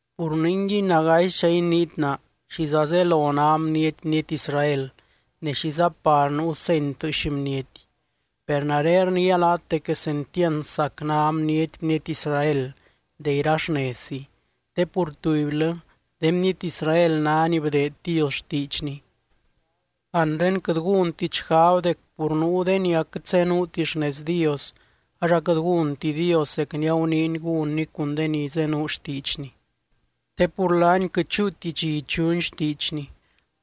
Pur ningui nagaisdxa iniit naa: ¿Xiza zelo ná bniety, bniety Israel? Ne, ¿xiza par nuu seny tɨɨx bniety? Per nare rniia laat dec quesentiand sac ná bniety, bniety Israel, de ira xnezzi, te pur tubylɨ, de bniety Israel ná ni bdeed Dios xtiidxny. Anre, quɨt gúntit xgab dec pur nuu de ni aquɨt zenuuti xnez Dios ax aquɨt gúnti Dios zec ni aguniiny gúnny cun de ni zenuu xtiidxny. Te pur laany quɨt chúuti dxi ichuny xtiidxny,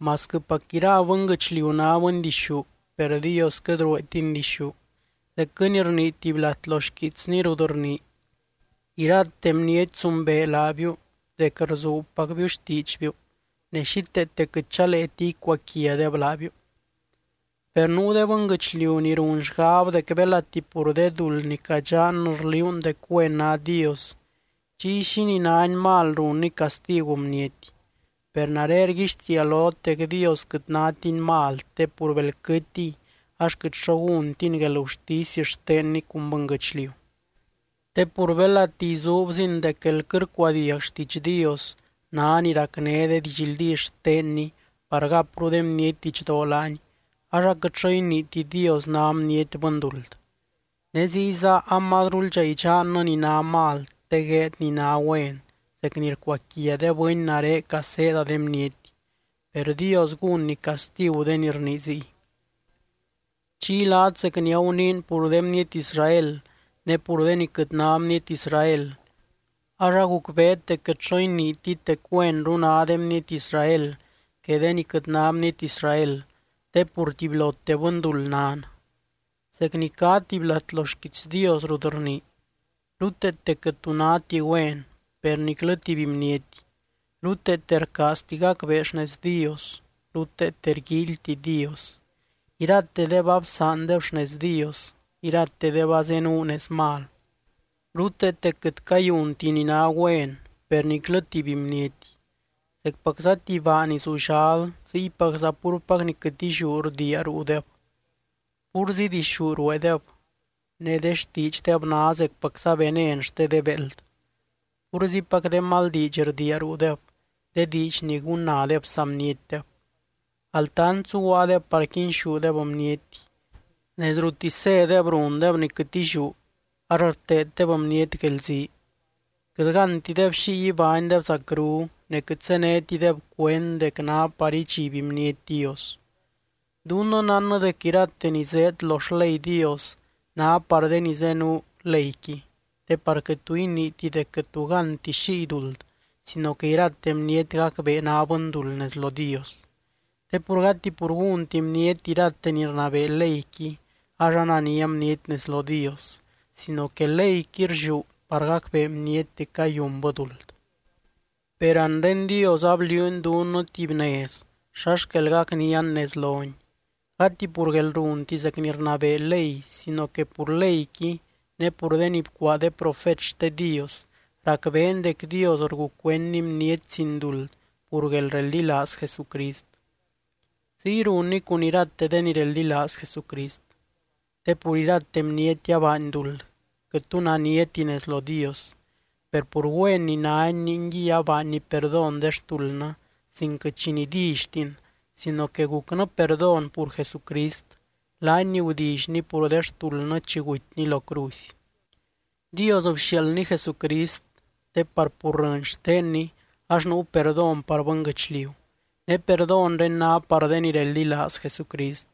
masquɨpac ira bɨnguɨchliu ná bɨndixú per Dios quɨt rueetiny dixú, zecquɨ ni rnii tuby lat lo xquiitsny rut rnii: Irate bniety zumbee laabiu dec rzuubpacbiu xtiidxbiu, ne xíteete quɨt chaleeti icuaquiadeb laabiu. Per nuu de bɨnguɨchliu ni run xgab dec belati pur de duld ni cadxannɨ rliuun dec güen ná Dios, chiy, ¿xínii nány mal runny castigu bniety? Per nare rguixtiia lot dec Dios quɨt nátiny mal te pur bel quɨtiy, ax quɨt xo gúntiny guelgurtisy xtenny cun bɨnguɨchliu. Te pur belati izuubzin dec guél quɨt rcuadiag xtiidx Dios ná ni racné de didxldí xtenny par gapru de bniety didxdoo laany, ax aquɨt xo iniiti Dios ná bniety bɨnduld. Ne ziyza amazruldxa idxannɨ ni ná mal te gueed ni ná güen zec ni rcuaquia de bɨny nare caseeda de bniety, per Dios gúnny castigu de ni rnii ziy. Chiy laat zec ni aguniin pur de bniety Israel ne pur de ni quɨt ná bniety Israel, ax agucbeet dec quɨt xo iniitit dec güenru ná de bniety Israel que de ni quɨt ná bniety Israel te pur tubylote bɨnduld nan. Zec ni cá tuby lat lo xquiits Dios rut rnii: Ruteete quɨt tu náti güen, per niclɨ tuby bniety. Ruteete rcaazti gacbee xnez Dios. Ruteete rguíilyti Dios. Iratedeb absaandeb xnez Dios. Iratedeb azenuu nez mal. Ruteete quɨt cayunti ni ná güen, per niclɨ tuby bniety. Zecpacza tuby baa ni zullal, ziypacza púrpac ni quɨt illiú rdiia ruudeb. Púrzi dixú rueedeb, ne de xtiidxdeb ná zecpacza venen xte de béeld. Púrzipac de mal diidx rdiia ruudeb, de diidx ni gunnadeb saa bnietdeb. Altant zuguaadeb par quinxúdeb bniety. Nez ruttisy zédeb rundeb ni quɨt illiú, ax rteeddeb bniety guelzii. Quɨt gántideb xiy ibánydeb zacru. Ne quɨt zénetideb cuend dec ná par idxiby bniety Dios. Dunnɨ nánnɨ dec irate ni zéed lo xley Dios ná par de ni zenuu leyqui, te par quɨt tu iniiti dec quɨt tu gánti xiy duld sino que irate bniety gacbee ná bɨnduld nez lo Dios. Te pur gati pur gúnti bniety irate ni rnabee leyqui ax anania bniety nez lo Dios, sino que leyqui rlliú par gacbee bniety dec cayunbɨ duld. Per anre Dios abliuuny dunnɨ tuby nez xa xquel gacnian nez lony, gati pur guelrunti zec ni rnabee ley sino que pur leyqui ne pur de ni bcuaa de profet xte Dios, racbeen dec Dios rgucuendny bniety sin duld pur guelreldilaaz Jesucrist, ziy runny cun irate de ni reldilaaz Jesucrist. Te pur irate bniety abaany duld, quɨt tu naniati nez lo Dios. Per pur güen ni nány, ningui abaanny perdón de xtuldnɨ sin quɨt xi nidillytin, sino que gucnɨ perdón pur Jesucrist, laany ni gudillyny pur de xtuldnɨ chi gutyny lo cruzy. Dios bxiaaldny Jesucrist te par pur rɨny xtenny ax nuu perdón par bɨnguɨchliu, ne perdónre ná par de ni reldilaaz Jesucrist.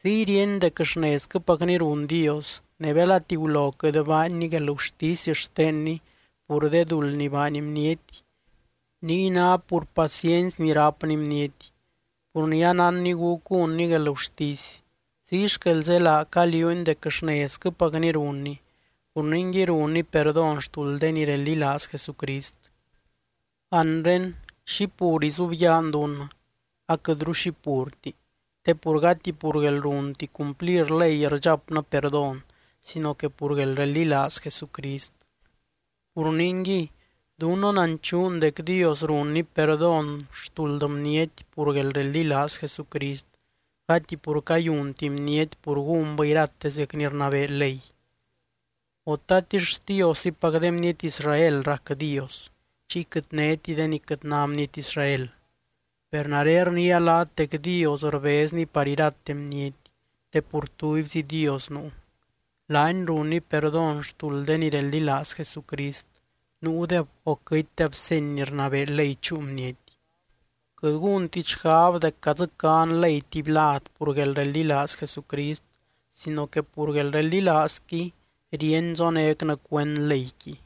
Ziy ríeny dec xnezquɨpacni run Dios, ne belati gulo quɨt baanny guelgurtisy xtenny pur de duld ni baany bniety, niy ná pur paciency ni rápny bniety pur ni anánny gúc gúnny guelgurtisy. Ziy xquel zélaa caliuuny dec xnezquɨpacni runny, pur ningui runny perdón xtuld de ni reldilaaz Jesucrist. Anre, ¿xi pur izubyaan dunnɨ? Aquɨtru xi purti, te pur gati pur guelrunti cumplir ley rdxapnɨ perdón sino que pur guelreldilaaz Jesucrist. Pur ningui dunnɨ nanchuun dec Dios runny perdón xtuld bniety pur guelreldilaaz Jesucrist, gati pur cayunti bniety pur gúnbɨ irate zec ni rnabee ley. O, ¿tatix Xtioszipac de bniety Israel rac Dios, chiy quɨt néti de ni quɨt ná bniety Israel? Per nare rniia laat dec Dios rbezny par irate bniety te pur tubyzi Dios nuu. Laany runny perdón xtuld de ni reldilaaz Jesucrist, nuudeb o quɨtdeb seny ni rnabee ley chúu bniety. Quɨt gúntit xgab dec cadzɨcán ley tuby lad pur guelreldilaaz Jesucrist sino que pur guelreldilaazqui ríeny zonécnɨ cuend leyqui.